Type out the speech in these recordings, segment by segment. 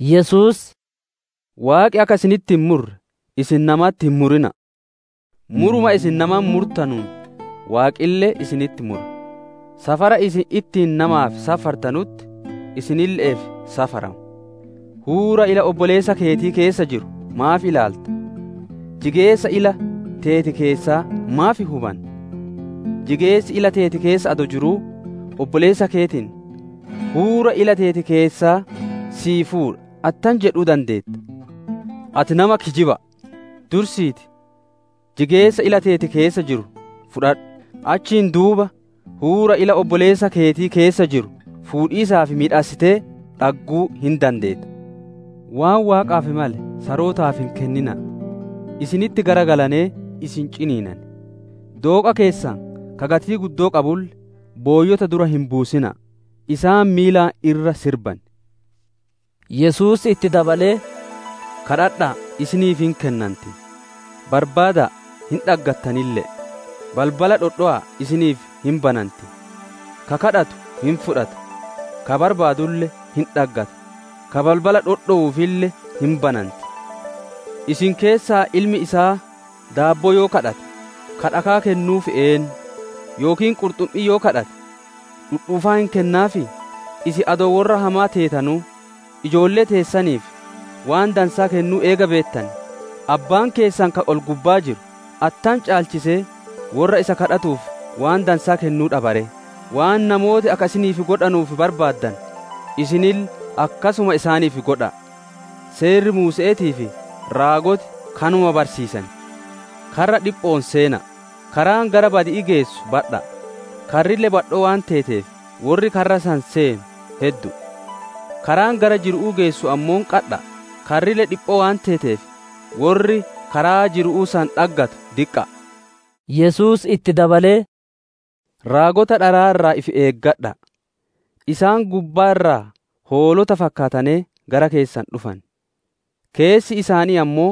Yesuus, «Waaqi akka isinitti hin murre, isin namatti hin murina'a. Muruma isin namatti murtanuun Waaqille isinitti mura; safaraa isin ittiin namaaf safartanutti isinille'eef safarama. «Huura ila obboleessa keetii keessa jiru maaf ilaalta! Jigeessa ila teeti keessaa maaf hin hubanne? Jigeessi ila teeti keessa adoo jiruu, obboleessa keetiin, ‹Huura ila teeti keessaa sii fuudha› attam jedhuu dandeetta? Ati nama kijiba'a! Dursiitii jigeessa ila teeti keessa jiru fudhadhu; achiin duuba huura ila obboleessa keetii keessa jiru fuudhiisaaf miidhassitee dhagguu hin dandeetta. «Waan Waaqaaf male sarootaaf hin kennina'a; isinitti garagalanee isin ciniinan. Dooqa keessan ka gatii guddoo qabulle booyyota dura hin buusina'a; isaan miilaan irra sirban» jedhe. Yesuus itti dabalee, «Gaafadha'a, isiniif hin kennanti; barbaada'a, hin dhaggattanille'e; balbala dhodhowa'a isiniif hin bananti. Ka gaafatu hin fudhata, ka barbaadulle hin dhaggata, ka balbala dhodhowuufille hin bananti. Isin keessa ilmi isaa daabboo yoo gaafate, ka dhakaa kennuuf eennu? Yookiin qurxummii yoo gaafate, dhudhuufaa hin kennaafii? Isin adoo worra hamaa teetanuu, ijoollee teessaniif waan dansaa kennuu eega beettanee, Abbaan keessan ka ol-gubbaa jiru, attam caalchisee, worra isa gaafatuuf waan dansaa kennuu dhaba ree! «Waan namooti akka isiniif godhanuuf barbaaddanu isinille akkasuma isaaniif godha'a: Seerri Muuse'eetii fi raagoti kanuma barsiisan. «Karra dhipho'oon seena'a! Karaan gara badi'ii geessu badha'a; karrille badhoo waan teeteef, worri karra san seenu heddu'u. Karaan gara jiru'uu geessu ammoo qadha'aa; karrille dhiphoo waan teeteef, worri karaa jiru'uu san dhaggatu diqqa'a» jedhe. Yesuus itti dabalee, «Raagota dharaa irraa ifi eeggadha'a; isaan gubbaa irra hoolota fakkaatanee, gara keessan dhufan; keessi isaanii ammoo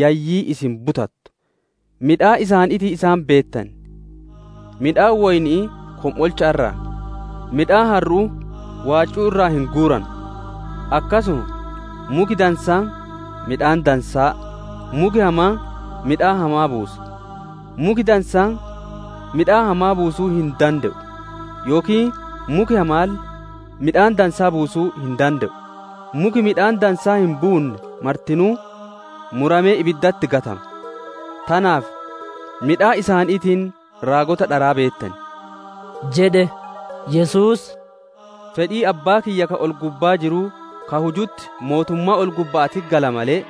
yayyii isin butattu. Midhaan isaaniitiin isaan beettan. Midhaan woyni'ii kom'olcha irraa, midhaan harru'uu waaccuu irraa hin guuranu. Akkasuma, muki dansaan midhaan dansaa, muki hamaan midhaan hamaa buusa. Muki dansaan midhaan hamaa buusuu hin dande'u; yookiin muki hamaalle midhaan dansaa buusuu hin dande'u. Muki midhaan dansaa hin buunne martinuu muramee ibiddatti gatama. Tanaaf midhaan isaaniitiin raagota dharaa beettan» jedhe. Yesuus, «Fedhii Abbaa kiyya ka ol-gubbaa jiruu ka hujutti mootummaa ol-gubba'aatitti gala malee,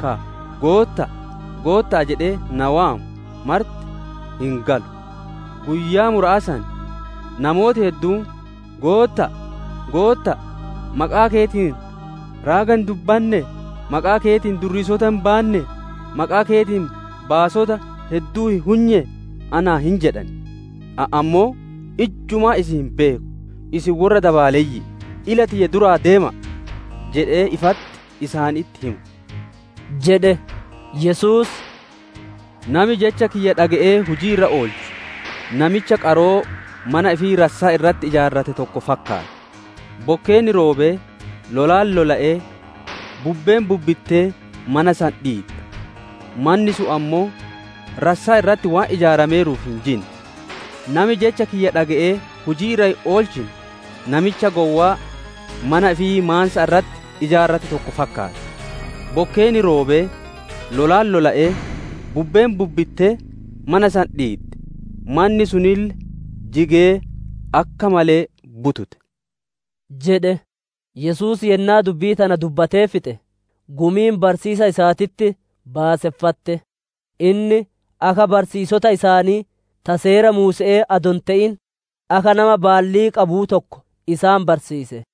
ka, ‹Gootta'a, Gootta'a› jedhee na waamu marti hin galu. Guyyaa mura'aa san, namooti hedduun, ‹Gootta'a, Gootta'a! Maqaa keetiin raaga hin dubbannee? Maqaa keetiin durriisota hin baannee? Maqaa keetiin baasota hedduu hin hunyee?› anaan hin jedhan. Ani ammoo, ‹Ijjumaa isin hin beeku. Isin worra dabaaleyyi'i; ila tiyya duraa deema'a!› jedhee ifatti isaanitti hima» jedhe. Yesuus, «Nami jecha kiyya dhage'ee hujii irra oolchu namicha qaroo mana ifii rassaa irratti ijaarrate tokko fakkaatta. Bokkeenni roobee, lolaan lola'ee, bubbeen bubbittee mana san dhiidde. Manni sun ammoo rassaa irratti waan ijaarameeruuf hin jinne. «Nami jecha kiyya dhage'ee hujii irra hin oolchine namicha gowwaa mana ifii maansa irratti ijaarrate tokko fakkaata. Bokkeenni roobee, lolaan lola'ee, bubbeen bubbittee mana san dhiidde. Manni sunille jigee akka malee butute» jedhe. Yesuus yennaa dubbii tana dubbatee fixe, gumiin barsiisa isaatitti baaseffatte. Inni akka barsiisota isaanii ta Seera Muuse'ee adoo hin te'in, akka nama baallii qabuu tokko isaan barsiise.